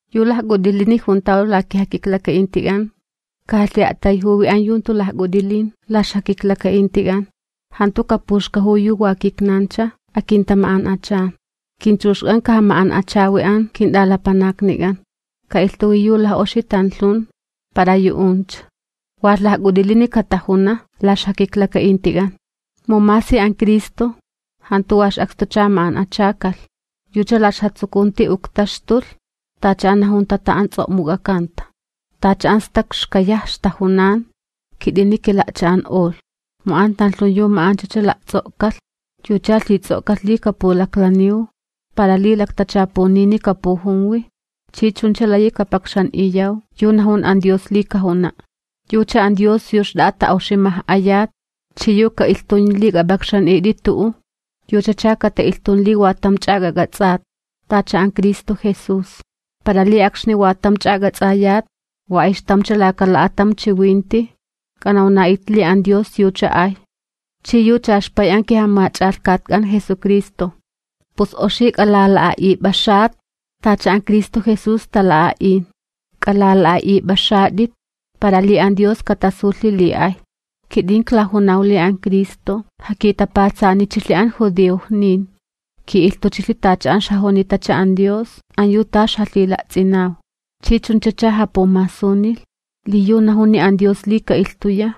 Yu lajk'ut'ilini juntaw la kijakiklaka'intik'an, kajalhi'a'tayjuwi an yu jantu lajk'ut'ilin la ixjakiklaka'intik'an, jantu kapuxkajuwi yu wa kitnancha akintama'an'achan. Kinchuxk'an kajama'an'achawi an kint'alapanaknik'an, ka'ilhtuwi yu laj'oxi tanlhun para yu'uncha, walh lajk'ut'ilini katajuna la ixjakiklaka'intik'an. Mu masi an Cristo, jantu wa ix'akstucha ma'an'achakalh, yucha la ixjatsukunti uktaxtulh tacha an najunta an tan ts'o'muk'akanta: “Tacha an stak xkayaj ixtajunan kit'ini kila'cha'an'olh.” Mu an tanlhun yu ma'anchacha la'ts'o'kalh, yucha lhits'o'kalh li kapulaklaniw para li laktachapunini kapujunwi chi chuncha layi kapakxan'iyaw yu najun an Dios li kajuna'. Yucha an Dios yu xt'a'a ta'oximaj'ayat chi yu ka'ilhtun li k'ap'akxan'it'i tu'u, yuchacha kata'ilhtun li wa tamcha k'ak'ats'at, tacha an Cristo Jesús, para li akxni wa tamcha k'ats'ayat, wa ayxtamcha laka la'atam chiwinti k'anawna'it li an Dios yucha ay chi yucha ixPay an kiJamach'alhkatk'an Jesucristo. Pus oxi k'alala'a'ip'axat tacha an Cristo Jesús tala'a'in, k'alala'a'ip'axat'it para li an Dios katasulhi li ay. Kit'in klajunaw li an Cristo jakitapatsanichilhi an judiojnin, ki'ilhtuchilhi tacha an ixjajunitacha an Dios an yu ta ixjalhila'ts'inaw, chi chunchacha japumasunilh li yu najuni an Dios li ka'ilhtuya,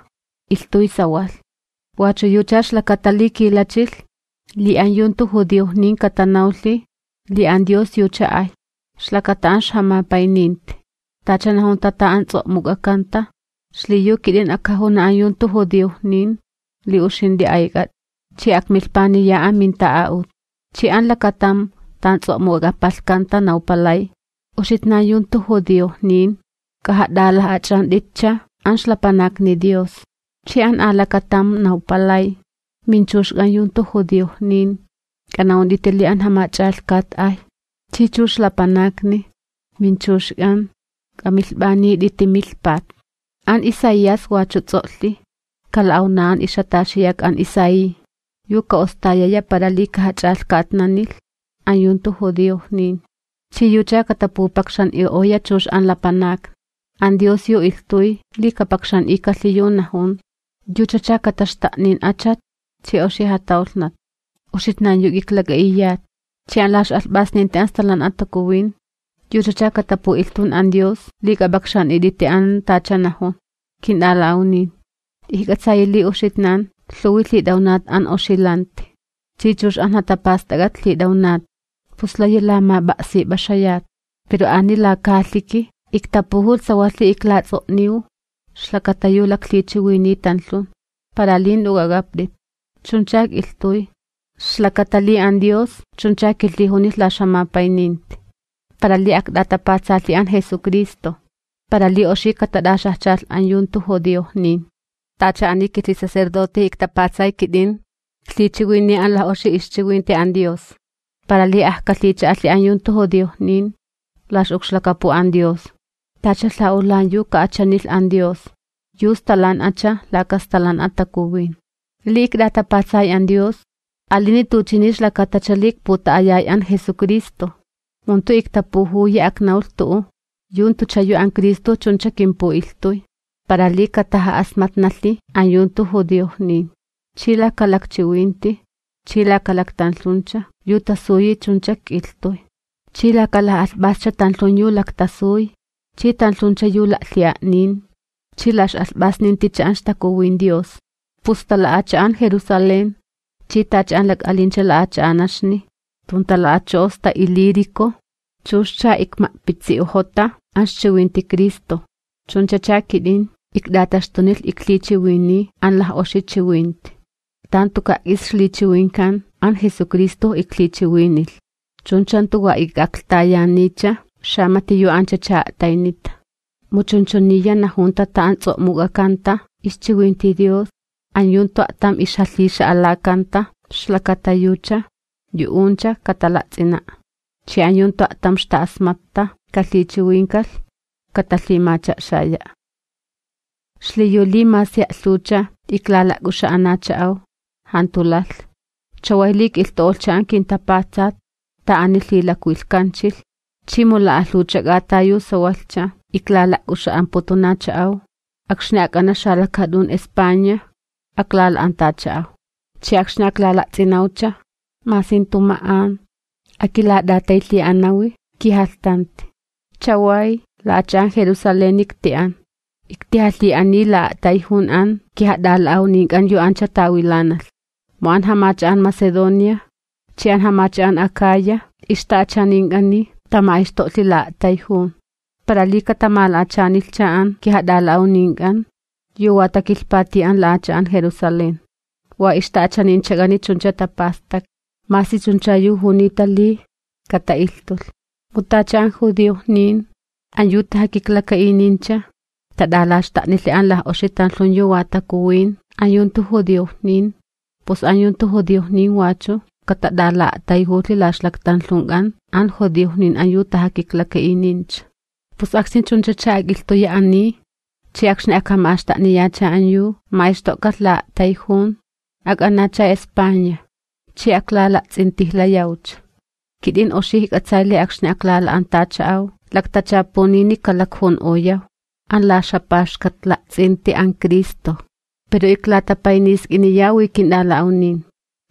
ilhtuy sawalh. Wachu yucha ixlakata li kilachilh, li an yu jantu judiojnin katanawlhi li an Dios yucha ay, ixlakata an ixjamapayninti, tacha najunta an tan ts'o'muk'akanta: Xliyu kit'in ajkajuna an yu jantu judiojnin li uxint'i ayk'at'i, chi akmilhpaniya aminta'a'ut. Chi an lakatam tan ts'o'muk'apalhkanta nawpalay: ¡Uxitnan yu jantu judiojnin, k'ajat'alaj'ach'ant'itcha an ixlapanakni Dios! Chi an alakatam nawpalay: Minchuxk'an yu jantu judiojnin, k'ana'unt'iti li an Jamach'alhkat ay, chi chux lapanakni, minchuxk'an, k'amilhp'anit'iti milhpat. An Isaías wachu ts'o'lhi: Kala'awna an ixjataxiyak an Isaí, yu ka'ostayaya para li kajach'alhkatnanilh an yu jantu judiojnin, chi yucha katapupakxan'i'oya chux an lapanakni. An Dios yu ilhtuy li kapakxan'ikalhi yu najun, yuchacha kataxta'nin achat chi oxi jatawlhnat, uxitnan yu k'iklak'a'iyat, chi an la ix'alhp'asninti an Stalan'a Takuwin yuchacha katapu'ilhtun an Dios li k'ap'akxan'it'iti an tacha najun. Kint'ala'awnin, ijk'atsayi li uxitnan lhuwi lhit'awnat an oxi lanti chi chux an jatapast'ak'at lhit'awnat, pus layi lamap'a'sip'axayat, pero ani laka jalhiki iktapujulh sawalhi klats'o'niw ixlakata yu laklhichiwiniy tanlhun, para li jant'u k'ak'apt'it. Chuncha k'ilhtuy, ixlakata li an Dios chuncha kilhijunilh la ixjamapayninti, para li akt'atapatsalhi an Jesucristo para li oxi katat'axajchalh an yu jantu judiojnin. Tacha ani kilhisacerdote iktapatsay k'it'in, iklhichiwiniy an laj'oxi ixchiwinti an Dios, para li ajkalhicha'alhi an yu jantu judiojnin la ix'ukxlakapu an Dios, tacha lha'ulan yu ka'achanilh an Dios, yu stalan'acha laka Stalan'a Takuwin. Li ikt'atapatsay an Dios, alini tuchini ixlakatacha li ikputa'ayay an Jesucristo. Mu jantu iktapujuyi aknawlh tu'u yu jantucha yu an Cristo chuncha kimpu'ilhtuy, para li kataja'asmatnalhi an yu jantu judiojnin. Chi laka lakchiwinti chi laka laktanlhuncha yu tasuyi chuncha k'ilhtuy, chi laka laj'alhp'ascha tanlhun yu laktasuy chi tanlhuncha yu la'lhi'a'nin chi la x'alhp'asninticha an ixTakuwin Dios. Pus sta la'acha'an Jerusalén chi tacha an lak'alincha la'acha'anaxni tuntala'acho'o sta Ilírico chuxcha ikma'pitsi'ojota an ixchiwinti Cristo. Chunchacha kit'in ikt'ataxtunilh iklhichiwiniy an laj'oxi chiwinti, tan tuka' k'is ixlichiwinkan an Jesucristojo iklhichiwinilh, chuncha jantu wa ik'aklhtayaniycha xamati yu anchacha a'taynita, mu chunchuniya najunta an tan ts'o'muk'akanta ixchiwinti Dios: An yu jantu a'tam ixjalhix'alakanta ixlakata yucha, yu'uncha katala'ts'ina'. Chi an yu jantu a'tam ixta'asmatta kalhichiwinkalh, katalhimacha'xaya'. Xliyu li masi a'lhuwcha iklala'k'uxa'anacha'aw, jantu lalh. Chaway li k'ilhtu'olhcha an kintapatsat tan ani lhilakwilhkanchilh chi mu la'alhuwcha k'ata yu sawalhcha iklala'k'uxa'amputunacha'aw, akxni ak'ana xalakaat'un España aklala'antacha'aw. Chi akxni aklala'ts'inawcha masi jantu ma'an, akilat'ataylhi'anawi kijalhtanti. Chaway la'acha'an Jerusaleni ikti'an, iktijalhi'aniy la'a'tayjun an kijat'ala'awnink'an yu ancha tawilanalh. Mu an jamacha'an Macedonia chi an jamacha'an Acaya ixta'achanink'ani tama'ayxto'lhi la'a'tayjun, para li katamala'achanilhcha an kijat'ala'awnink'an yu wa takilhpati an la'acha'an Jerusalén. Wa ixta'achaninchak'ani chuncha tapastaklhi, masi chuncha yu junita li kata'ilhtulh, mu tacha an judiojnin an yu tajakiklaka'inincha tat'alaxta'nilhi an laj'oxi tanlhun yu wa takuwin an yu jantu judiojnin, pus an yu jantu judiojnin wachu katat'ala'a'tayjulhi la ixlaktanlhunk'an an judiojnin yu an tajakiklaka'inincha. Pus akxni chunchacha ak'ilhtuya ani, chi akxni ajkama'axta'niyacha an yu ma'ayxto'kalh la'a'tayjun, ak'anacha España chi aklala'ts'intijlayawcha. Kit'in oxi ijk'atsay li akxni aklala'antacha'aw laktachapunini kalakjun'oyaw an la ixjapaxkatla'ts'inti an Cristo. Pero iklatapaynisk'iniyawi kint'ala'awnin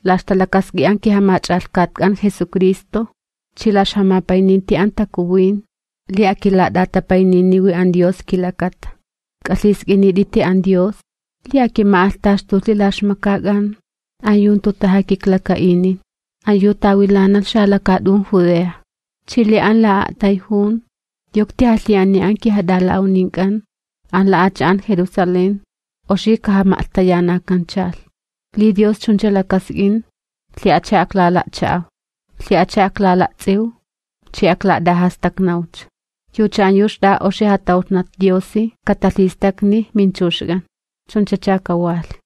la ixtalakask'i an kiJamach'alhkatk'an Jesucristo chi la ixjamapayninti an Takuwin li akilat'atapayniniwi an Dios kilakata. K'alhisk'init'iti an Dios li akima'alhtaxtulhi la ixmakak'an an yu jantu tajakiklaka'inin, an yu tawilanalh xalakaat'un Judea. Chi li an la'a'tayjun yu iktijalhi'aniy an kijat'ala'awnink'an an la'acha'an Jerusalén oxi kajama'lhtayanankanchalh. Li Dios chuncha lakask'in, lhi'acha aklala'cha'aw, lhi'acha aklala'ts'iw chi aklat'ajastaknawcha. Yucha an yu xt'a'a oxi jatawlhnat Diosi katalhistakni minchuxk'an. Chunchacha kawalh.